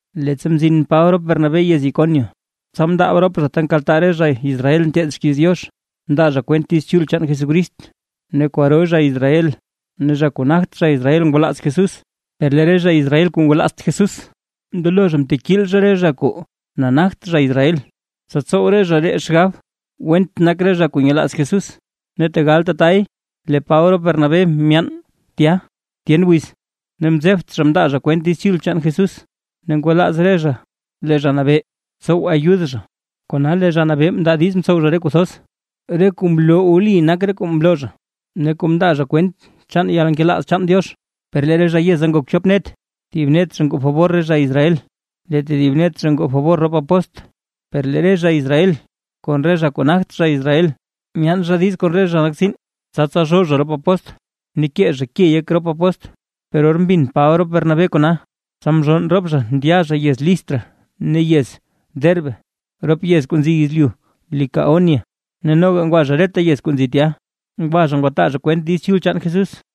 Leettsa mzin Paba rop Bernabé yez Iconio, tsa mndaab rop zha ta nkaltaa re zha Israel nteed xkiiz Diox, mndaa zha kwent Diiz Chul chaan Jesús ne kwaro zha Israel ne zha kuu nagt zha Israel ngwalaaz Jesús. Per lee re zha Israel kuu ngwalaazt Jesús, mndelo zha mtekiil zha re zha kuu nagt zha Israel, tsa tsow re zha ree xgab went nak re zha kuu nyelaaz Jesús. Ne tegal tatay lee Paba rop Bernabé myaan tya tyen wiz, ne mzebt zha mndaa zha kwent Diiz Chul chaan Jesús, ne ngwalaaz zha lee Zha Nabee tsow ayud zha. Kona lee Zha Nabee mndaa diiz mtsow zha re kuu thoz, re kuu mloo wli nak re kuu mloo zha, ne kuu mndaa zha kwent chaan yalnkelaaz chaan Diox. Per lee re zha yeza ngok chop net zha, thib net zha ngoo fabor re zha Israel lee tedib net zha ngoo fabor rop apóstl. Per lee re zha Israel kon re zha kuu nagt zha Israel myaan zha diiz kon re zha kuu nak tsiin, tsa tsalzhoo zha rop apóstl ne kee zha ke yek rop apóstl. Per or mbin Paba rop Bernabé kona, tsa mzhonn rop zha ndya zha yez Listra ne yez Derbe rop yez kuu nzi yezlyu Licaonia, ne noga ngwa zha reta yez kuu nzi tya, ngwa zha ngwataa zha kwent Diiz Chul chaan Jesús.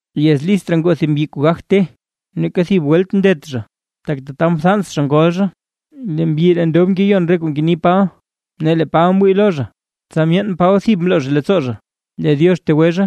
Yez Listra ngoo thib mbyi kuu gagt te, neeka thib welt mndet zha, tak tataʼa mthans zha ngol zha. Lee mbyi ree ndob, ngeyon re kuu ngeni Paba. Ne lee Paba mwii lo zha, tsa myeen Paba thib mloo zha leettsoo zha lee Diox tegwe zha.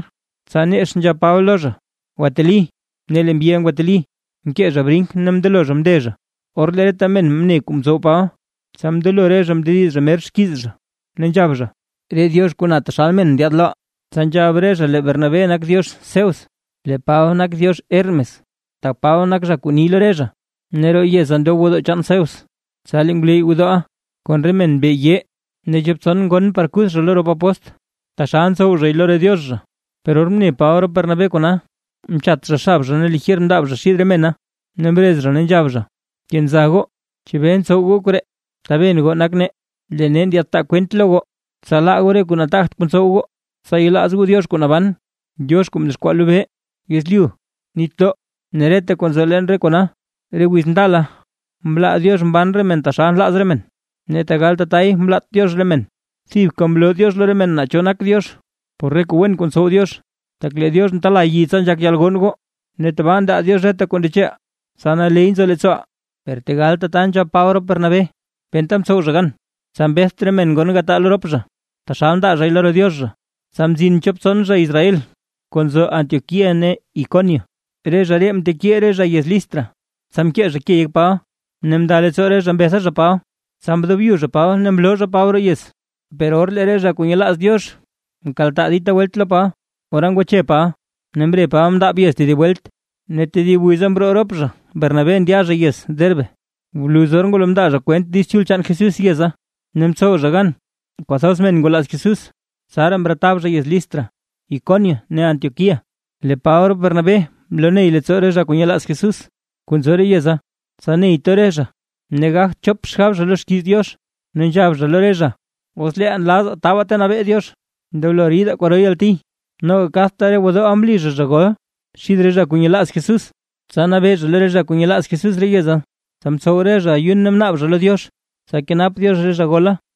Tsa nex nzhab Paba lo zha: ―¡Gwateli! Ne lee mbyiʼa ngwateli, mkee zha brink ne mndelo zha mnde zha. Or lee reta men mne kuu mtsow Paba, tsa mndelo re zha mndediz zha mer xkiiz zha ne nzhab zha: ―¡Re diox kuu na taxal men ndyaad loʼaa! Tsa nzhab re zha lee Bernabé nak diox Zeus, lee Paba nak diox Hermes, tak Paba nak zha kuu ni lo re zha. Ne roo yeza ndob gwodoo chaan Zeus, tsa lee ngwleyy gwodooʼa kon re men mbe yee ne chop tson ngon par kuth zha lo rop apóstl, taxal ntsow zhay lo re diox zha. Per or mne Paba rop Bernabé kona, mchat zha xab zha ne lijer mndaab zha xid re mena, ne mrez zha ne nzhab zha: ―¡Kenza goo! ¿Chebee ntsow goo koree? Taben goo nak nee, lee nee ndyaadtaa kwent lo goo, tsa laa goo re kuu nataagt kuu ntsow goo. Tsa yelaaz goo Diox kuu naban, Diox kuu mdexkwaa lobee, yezlyu, nitdoo ne reta kuu nzo leen re kona. Re wiz ndala mlaa Diox mban re men taxal nlaaz re men, ne tegal tatay mlaat Diox re men, thibka mloo Diox lo re men naa cho nak Diox, por re kuu wen kuu ntsow Diox, tak lee Diox ntela yi tsa nzhak yalgonn goo, ne tabaa ndaa Diox reta kuu ndecheʼaa, tsa naley nzo leettsooʼaa. Per tegal tata nzhab Paba rop Bernabé, penta mtsow zha gan tsa mbeth re mena ngon gataa lo rop zha, taxal ndaa zhay lo re diox zha. Tsa mzin chop tson zha Israel kuu nzo Antioquía ne Iconio, re zha ree mtekiil re zha yez Listra, tsa mkee zha ke yek Paba, ne mnda leettsoo re zha mbetha zha Paba, tsa mdobyu zha Paba ne mloo zha Paba roo yez. Per or lee re zha kuu nyelaaz Diox mkaltaa dita welt lo Paba, ora ngwache Paba ne mre Paba mndaab yez tedib welt. Ne tedib wiza mroo rop zha Bernabé ndya zha yez Derbe. Bluz or ngwalo mndaa zha kwent Diiz Chul chaan Jesús yeza, ne mtsow zha gan kwathoz men ngwalaaz Jesús, tsaraa mretab zha yez Listra, Iconio ne Antioquía. Lee Paba rop Bernabé mloney leettsoo re zha kuu nyelaaz Jesús kuu nzo re yeza, tsa ney to re zha ne gagt chop xgab zha lo xkiiz Diox, ne nzhab zha lo re zha: “Os leeʼaa nlaazaa tabaa ta nabee Diox, ndoblo ridaa kwaro yalti”. Noga kadta re gwodooʼa mli zha zha gol xid re zha kuu nyelaaz Jesús, tsa nabee zha lo re zha kuu nyelaaz Jesús re yeza. Tsa mtsow re zha ayun ne mnaab zha lo Diox tsa kenap Diox re zha gola.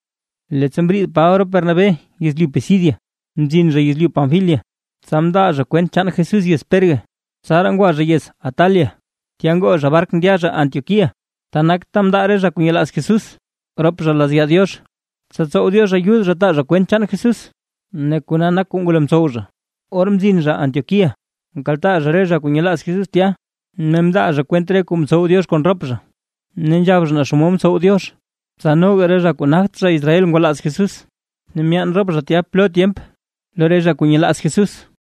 Leettsa mriid Paba rop Bernabé yezlyu Pisidia, mzin zha yezlyu Panfilia. Tsa mndaa zha kwent chaan Jesús yez Perge, tsaraa ngwa zha yez Atalia, tya ngoo zha bark ndya zha Antioquía. Ta nak ta mndaa re zha kuu nyelaaz Jesús rop zha lazya Diox, tsa tsow Diox ayud zha taa zha kwent chaan Jesús, ne kona nak kuu ngwalo mtsow zha. Or mzin zha Antioquía, mkaltaa zha re zha kuu nyelaaz Jesús tya, ne mndaa zha kwent re kuu mtsow Diox kon rop zha. Ne nzhab zha naa xomod mtsow Diox, tsa noga re zha kuu nagt zha Israel ngwalaaz Jesús. Ne myaan rop zha tya plo tyemp lo re zha kuu nyelaaz Jesús.